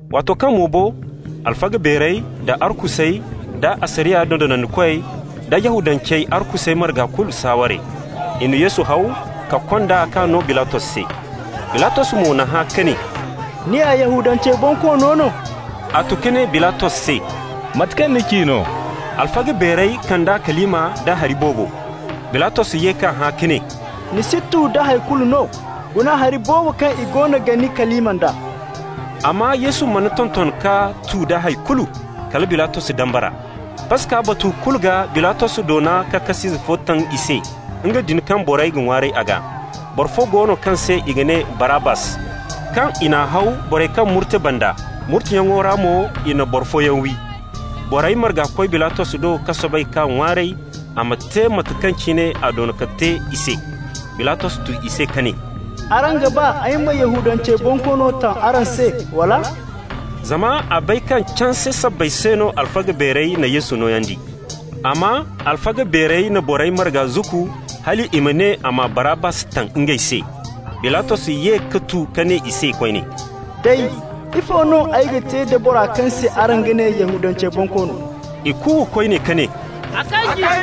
Waato kaŋ mo bo, alfaga beerey da arkusey da asariya dondonandikoy da Yahudancey arkusey marga kulu saaware. I na Yesu haw ka kond'a k'a no Bilatos se. Bilatos mo n'a hã ka ne: «Ni ya Yahudancey bonkoono no?» A tu ka ne Bilatos se: «Mate kaŋ ni ci no.» Alfaga beerey kand'a kalima nda hari boobo. Bilatos ye k'a hã ka ne: «Ni si tu da hay kulu no? Guna hari boobo kaŋ i goono ga ni kalima nd'a.» Amma Yesu mana tonton ka tu da hay kulu, kala Bilatos dambara. Paska batu kulu gaa Bilatos doona ka kas'ize fo taŋ i se, nga din kaŋ borey ga ŋwaaray a gaa. Boro fo go no kaŋ se i ga ne Barabbas, kaŋ i n'a haw borey kaŋ murte banda, murteyaŋo ra mo i na boro fooyaŋ wi. Borey marga koy Bilatos do ka soobay k'a ŋwaaray a ma te mate kaŋ cine a doona ka te i se. Bilatos tu i se ka ne: «Araŋ ga ba ay ma Yahudancey bonkoono taŋ araŋ se, wala?» Zama a bay kaŋ canse sabbay se no alfaga beerey na Yesu nooyandi. Amma alfaga beerey na borey marga zukku hal i ma ne a ma Barabbas taŋ ngey se. Bilatos ye ka tu ka ne i se koyne: «Day, ifo no ay ga te da boro kaŋ se araŋ ga ne Yahudancey bonkoono?» I kuuwa koyne ka ne: «A kanji!»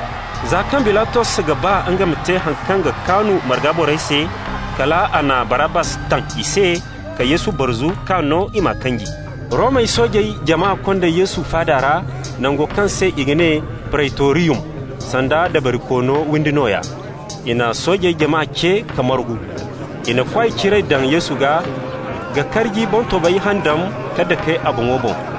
Za kaŋ Bilatos ga ba nga ma te haŋ kaŋ ga kaanu marga borey se, kal a na Barabbas taŋ i se ka Yesu barzu k'a no i m'a kanji. Romey soojey jama konda Yesu faada ra, nango kaŋ se i ga ne Preytoriyum, sanda dabarikoono windi nooya. I na soojey jama ce ka margu. I na kwaay ciray daŋ Yesu gaa ka karji boŋtobay handam ka dake a boŋo boŋ.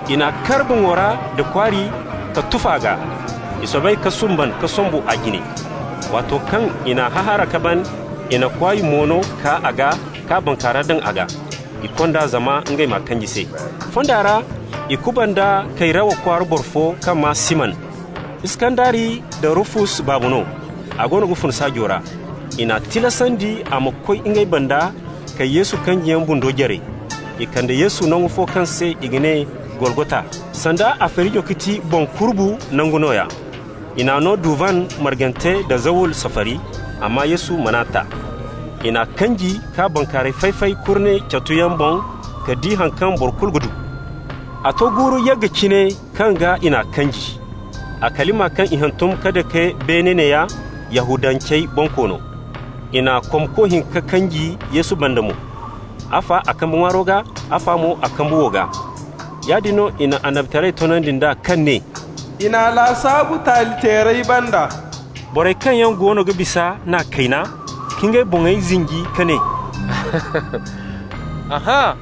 I n'a kar boŋo ra nda kwaari ka tuf'a gaa. I soobay ka sumbal ka sombu a jine. Waato kaŋ i n'a hahaara ka ban, i na kwaay mono kaa a gaa k'a bankaara daŋ a gaa. I kond'a zama ngey m'a kanji se. Fonda ra i kubanda Kayrawa kwaara boro fo kaŋ maa Siman, Iskandari nda Rufus baaba no. A goono ga fun saajo ra. I n'a tilasandi a ma koy ngey banda ka Yesu kanjiyaŋ bundo jare. I kande Yesu nangu fo kaŋ se i ga ne Golgota, sanda a feerijo ga ti Boŋ Kurubu Nangu nooya. I n'a no duvan margante nda zawul safari. Amma Yesu man'a ta. I n'a kanji k'a bankaarayey fay-fay kurne catuyaŋ boŋ ka di haŋ kaŋ boro kulu ga du. A to guuru yagga cine kaŋ gaa i n'a kanji. A kalima kaŋ i hantum ka daŋ beene neeya: YAHUDANCEY BONKOONO. I na komko hinka kanji Yesu banda mo, afa a kambe ŋwaaro gaa, afa mo a kambe wow gaa. Yaadin no i na annabitaray toonandi nd'a kaŋ ne: «I n'a lasaabu taali-teerey banda.» Borey kaŋ yaŋ goono ga bisa n'a kayna, ka ngey boŋey zinji ka ne: «Ahãa,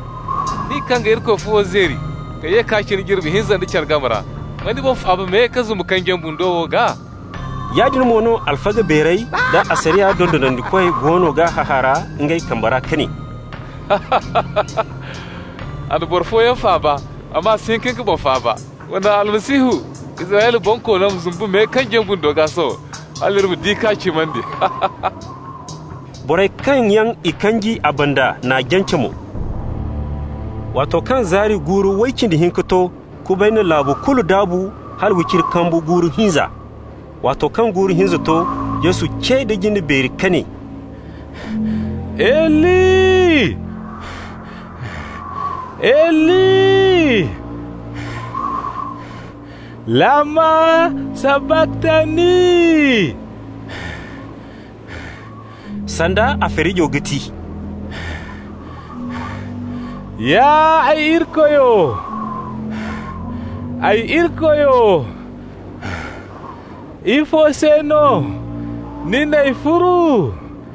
nin kaŋ ga Irikoy fuwo zeeri ka ye k'a cina jirbi hinza nda care game ra! Ma ni boŋ faaba me, ka zumbu kanjiyaŋ bundo wo gaa!» Yaadin mo no alfaga beerey da asariya dondonandikoy goono g'a hahaara ngey game ra ka ne: «A na boro fooyaŋ faaba, amma a si hin ka nga boŋ faaba. Wa naŋ Almasihu, Israyla Bonkoono ma zumbu me kanjiyaŋ bundo gaa sohõ, hal iri ma di ka cimandi.» Borey kaŋ yaŋ i kanji a banda n'a jance mo. Waato kaŋ zaari guuru way cindi hinka to, kubay na laabu kulu daabu hala wiciri kambu guuru hinza. Waato kaŋ guuru hinza to, Yesu ce nda jinde beeri ka ne: «Eli, Eli, lama sabaktani!» (sanda a feerijo ga ti: «Ya ay Irikoyo, ay Irikoyo, ifo se no ni n'ay furu?»)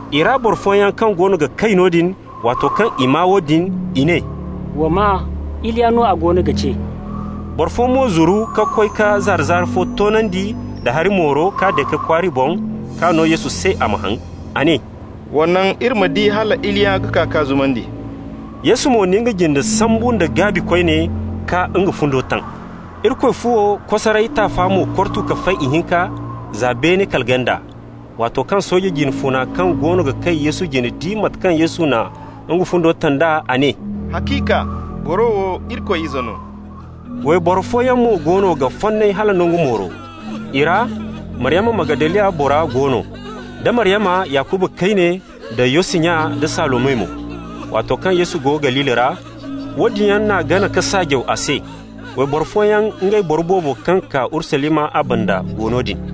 I ra boro fooyaŋ kaŋ goono ga kay noodin, waato kaŋ i maa woodin, i ne: «Wa maa, Iliya no a goono ga ce.» Boro fo mo zuru ka koy ka zaara-zaara fo toonandi nda hari mooro k'a dake kwaari boŋ k'a no Yesu se a ma haŋ. A ne: «Wa naŋ, iri ma di hal Iliya ga kaa k'a zumandi.» Yesu mo na nga jinde sambu nda gaabi koyne, ka nga fundo taŋ. Irikoy fuwo kosaray taafa mo kortu ka fay ihinka za beene kala ganda. Waato kaŋ sooje jine funa kaŋ goono ga kay Yesu jine di mate kaŋ Yesu na nga fundo taŋ d'a, a ne: «Haciika, boro wo Irikoy Ize no.» Wayboro fooyaŋ mo goono ga fonnay hala nangu mooro. I ra Maryama Magdaliya bora go no, da Maryama, Yakuba kayne da Yosi nya, da Salome mo. Waato kaŋ Yesu go Galili ra, woodin yaŋ n'a gana ka saajaw a se. Wayboro fooyaŋ, ngey boro boobo kaŋ kaa Urusalima a banda, go noodin.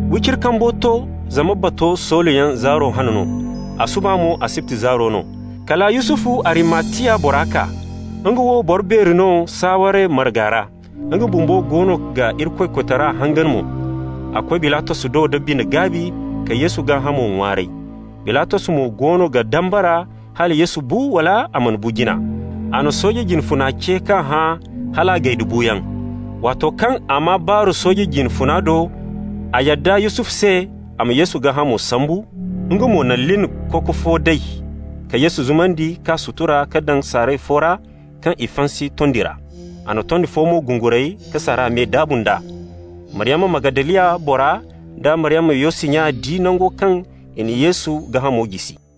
Wiciri kambo to, zama bato soolayaŋ zaaro hane no, a suba mo asibti zaaro no, kala Yusufu, Arimatiya bora kaa. Nga wo boro beeri no saaware marga ra, nga bumbo goono ga Irikoy koytara hangan mo. A koy Bilatos do da bine-gaabi ka Yesu gaahamo ŋwaaray. Bilatos mo goono ga dambara hala Yesu bu wala a mana bu jina. A na sooje jine funa ce k'a hã hala a gay da buuyaŋ. Waato kaŋ a maa baaru sooje jine funa do, a yadda Yusufu se a ma Yesu gaahamo sambu. Nga mo na lin koko fo day ka Yesu zumandi k'a sutura ka daŋ saaray fo ra kaŋ i fansi tondi ra. A na tondi fo mo gunguray ka saara me daabu nd'a. Maryama Magdaliya bora, da Maryama Yosi nya di nango kaŋ i n'a Yesu gaahamo jisi.